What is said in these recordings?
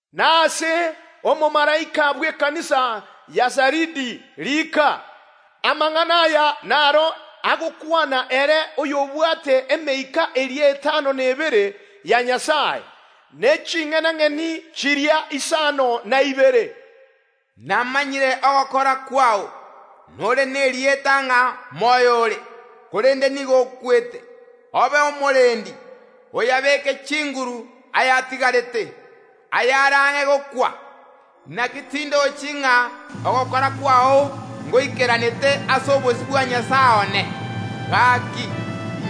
“Na ase omomalaika bw’ekanisa ya Saridi riika: Amang’ana aya naro agokwana, ere oyobwate emeika eria etano na ebere ya Nyasae, ne ching’enang’eni chiria isano na ibere. “Namanyire ogokora kwao. Nore nerieta ng’a moyo ore, korende nigo okwete. Obe omorendi, oyabeeke chinguru ayatigarete, ayare ang’e gokwa. Naki tindochi ng’a ogokora kwao ngoikeranete ase obosio bwa Nyasae one. Gaki,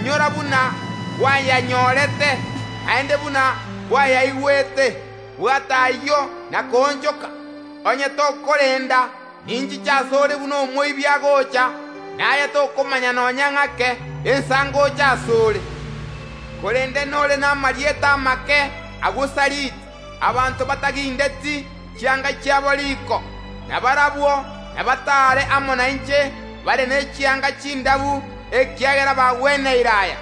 inyora buna kwayanyorete, naende buna kwayaigwete; bwata ayio na koonchoka. Onye tokorenda ninchiche ase ore buna omoibi agocha, na aye tokomanya nonya ng’ake ensa ngocha ase ore. Korende nore namarieta amake agwo Saridi, abanto batagindeti chianga chiabo riko, na barabwo nabataare amo nainche bare ne chianga chindabu, ekiagera bagweneire aya.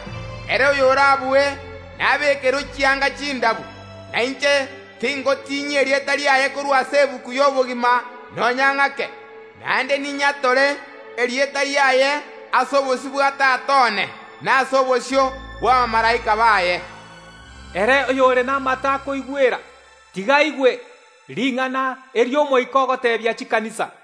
Ere oyorabue nabeekerwe chianga chindabu, na inche tingotinyia erieta riaye korwa ase egetabu y’obogima nonya ng’ake, naende ninyatore erieta riaye ase obosio bwa Tata one, na ase obosio bw’abamalaika baye. Ere oyore namato akoigwera, tiga aigwe ring’ana eri Omoika ogoteebia chikanisa.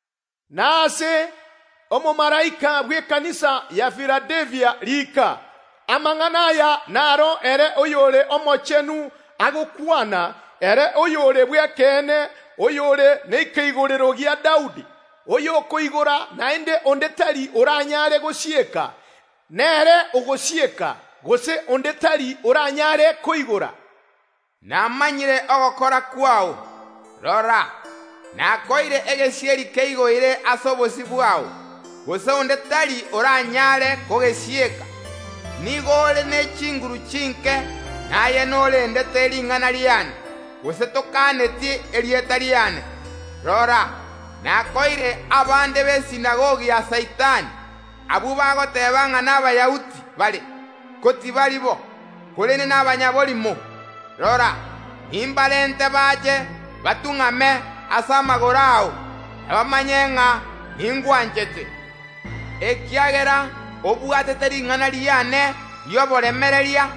“Na ase omomalaika bw’ekanisa ya Filadelfia riika: Amang’ana aya naro ere oyore omochenu agokwana, ere oyore bw’ekeene, oyore nekeigorero gia Daudi, oyokoigora, naende onde tari oranyare gosieka, nere ogosieka, gose onde tari oranyare koigora. “Namanyire ogokora kwao. Rora, nakoeire egesieri keigoire ase obosio bwao, gose onde tari oranyare kogesieka. Nigo ore ne chinguru chinke, na aye norendete ring’ana riane, gose tokaneti erieta riane. Rora, nakoeire abande b’ekeombe gia ya Saitani, abwo bagoteeba ng’a n’Abayahudi bare, ko tibari bo, korende nabanyaborimo. Rora, nimbarente bache batung’ame ase amagoro ao, na bamanye ng’a ningwanchete. Ekiagera obwatete ring’ana riane ri’oboremereria,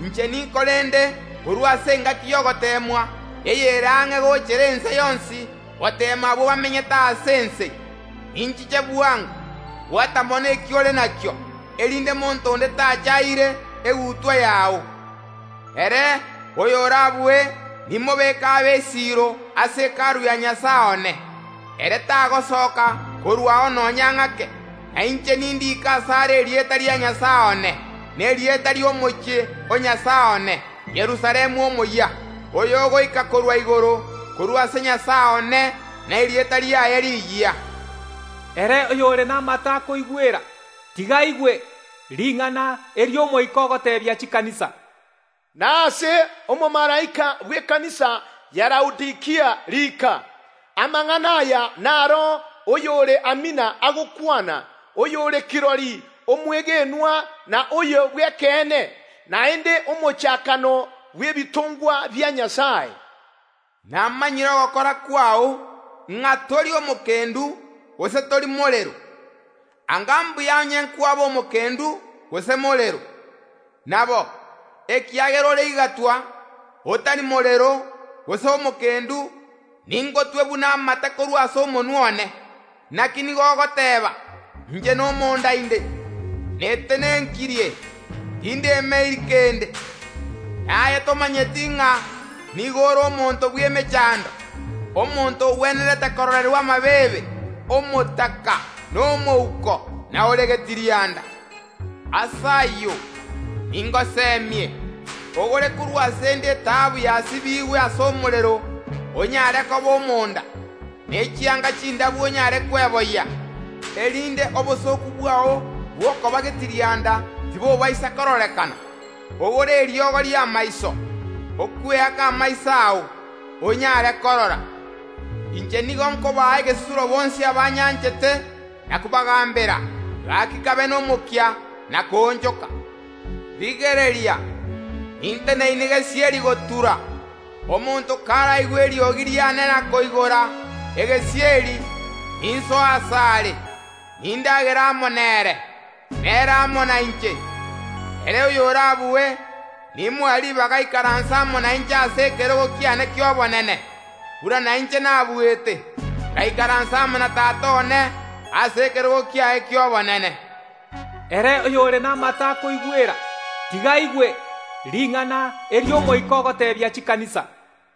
inche ninkorende korwa ase engaki y’ogoteemwa eyere ang’e gochera ense yonsi goteema abwo bamenyete ase ense. Ninchiche bwango. Bwata mono eki ore nakio, erinde monto onde tacha aire egutwa yao. Ere oyorabue nimobeke abe esiiro ase Hekalu ya Nyasae one, ere tagosoka korwao nonya ng’ake, na inche nindiike asare erieta ria Nyasae one, na erieta ri’omochie o Nyasae one, Yerusalemu omoyia, oyogoika korwa igoro, korwa ase Nyasae one, na erieta riane riyia. Ere oyore namato akoigwera, tiga aigwe ring’ana eri Omoika ogoteebia chikanisa. “Na ase omomalaika bw’ekanisa ya Laodikia riika: Amang’ana aya naro oyore Amina agokwana, oyore kirori omwegenwa na oyo bw’ekeene, naende omochakano bw’ebitongwa bia Nyasae. “Namanyire ogokora kwao, ng’a tori omokendu, gose tori morero. Anga mbuya onye nkwaba omokendu gose morero. Nabo, ekiagera ore igatwa, otari morero gose omokendu, ningotwe buna amate korwa ase omonwa one. Naki nigo ogoteeba: Inche nomonda inde! Netenenkirie! Tindemeiri kende. Na aye tomanyeti ng’a nigo ore omonto bw’emechando, omonto ogwenerete kororerwa amabeebe, omotaka, na omouko, na ore getirianda. Ase ayio, ningosemie, ogore korwa ase ’nde etaabu yasibigwe ase omorero onyare koba omonda, ne chianga chindabu onyare kweboyia, erinde obosooku bwao bw’okoba getirianda tibobaisa kororekana. Ogore eriogo ri’amaiso okweaka amaiso ao, onyare korora. Inche nigo nkobaa egesusuro bonsi abanyanchete, na kobagambera; gaki kabe nomokia na koonchoka. Rigereria, ninteneine gesieri gotura; omonto karaigwe eriogi riane na koigora egesieri, ninsoe asare, nindagere amo nere, na ere amo nainche. Ere oyorabue, nimoe ribaga aikaranse amo nainche ase ekerogo kiane ki’obonene, buna nainche nabuete, ngaikaransa amo na Tata one ase ekerogo kiaye ki’obonene. Ere oyore namato akoigwera, tiga aigwe ring’ana eri Omoika ogoteebia chikanisa.”